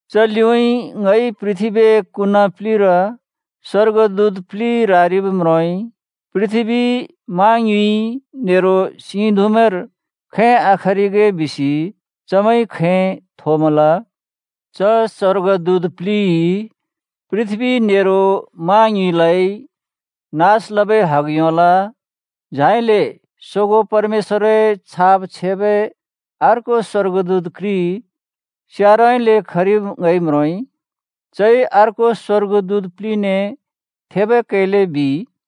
च लिउँइँ ङइ पृथ्‍बीए कुना प्‍लिर स्‍वर्गदूत प्लि रारिब् म्रोंइ। पृथ्‍बी, मा ङ्युँइ नेरो सिं धुँमैंर खैं आखरिगे बिसि चमैंइ खैं थोमल। च स्‍वर्गदूत प्लिइ पृथ्‍बी नेरो मा ङ्युँइलाइ नास लबै हग योंल। झाइले सोगों परमेश्‍वरए छाप छेबै अर्को स्‍वर्गदूत घ्रि स्यारउँइँले खरिब् ङइ म्रोंइ। चइ अर्को स्‍वर्गदूत प्लिने थेबै कैले बिइ,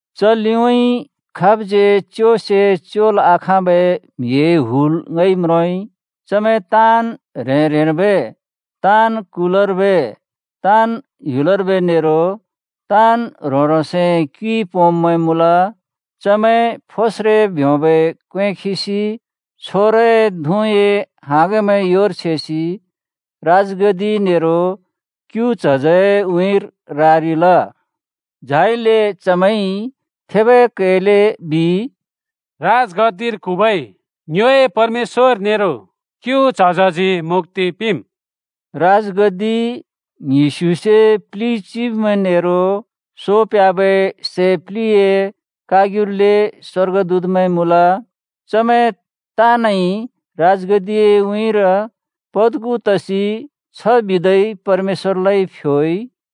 च लिउँइँ खाबज्‍यै च्योसे च्‍योल् आखाँबै म्‍हिए हुल ङइ म्रोंइ। चमैं ताँन् ह्रें-ह्रेंर्बै, ताँन् कुलर्बै, ताँन् ह्‍युलर्बै नेरो ताँन् ह्रों-ह्रोंसए क्युइ पोंब्‍मैं मुँल। चमैं फोस्रे ब्योंबै क्‍वें खिसि छोरए धुँए हाँगमैं योर छेसि राजगद्दि नेरो क्‍यु च्हजए उँइँर रारिल। झाइले चमैंइ थेबै कैले बिइ, “राजगद्दिर क्हुँबै ङ्योए परमेश्‍वर नेरो क्‍यु च्हजजी मुक्‍ति पिंम्।” राजगद्दि, ङ्हिस्युसे प्लि चिब्मैं नेरो सो प्ह्‍याबै सै प्लिए कारग्युले स्‍वर्गदूतमैं मुँल। चमैं ताँनइ राजगद्दिए उँइँर पद्खु तसि छ बिदै परमेश्‍वरलाइ फ्योइ,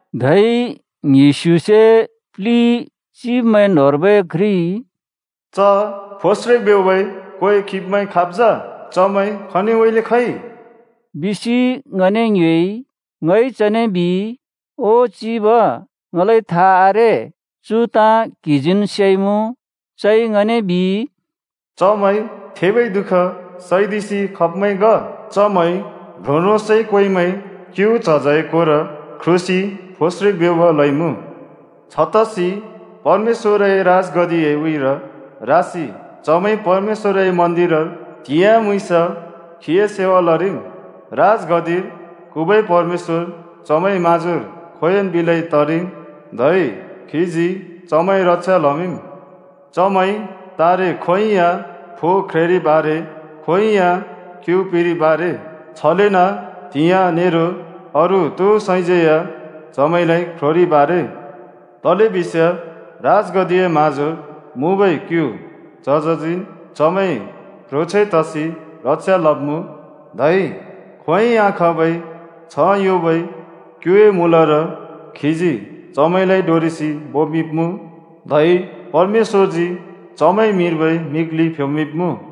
धै ङ्हिस्युसे प्लि चिब्मैं न्‍होंर्बै घ्रिइ “च फोस्रे ब्योंबै क्‍वें खिब्‍मैं खाब् जा? चमैं खनिउँइँले खइ?” बिसि ङने ङ्योएइ। ङइ चने बिइ, “ओ चिब, ङलाइ था आरे। चु ताँ क्‍हिजीन् सेइमुँ।” चइ ङने बिइ, “चमैं थेबै दुःख सैदिसि खब्‍मैं ग। चमैंइ ह्रों-ह्रोंसए क्‍वेंमैं क्‍यु च्हजए कोर ख्रुसि फोस्रे ब्योंब लइमुँ। छतसि परमेश्‍वरए राजगद्दिए उँइँर रासि चमैंइ परमेश्‍वरए मन्‍दिरर त्‍हिंयाँ, म्‍हुँइँस खीए सेवा लरिम्। राजगद्दिर क्हुँबै परमेश्‍वर चमैंए म्हाँजोर खोंयोंन् बिलै तरिम् धै खीजी चमैंए रक्षा लमिंम्। चमैं तारे खोंयोंइ या फो ख्रेंरिब् आरे, खोंयोंइ या क्‍यु पिरिब् आरे। छलेन त्‍हियाँ नेरो अरू तो सैज्‍यै या चमैंलाइ ख्रोंरिब् आरे। तलेबिस्याँ राजगद्दिए म्‍हाँजोर मुँबै क्‍यु च्हजजीन् चमैंए प्‍ह्रोंछैं तसि रक्षा लब्मुँ, धै खोंयोंइ आखाँबै छ्ह योंबै क्‍युए मूलर खीजी चमैंलाइ डोरेसि बोमिंब्‍मुँ। धै परमेश्‍वरजी चमैंए मिर्बै मिग्लि फ्‍योमिंब्‍मुँ।”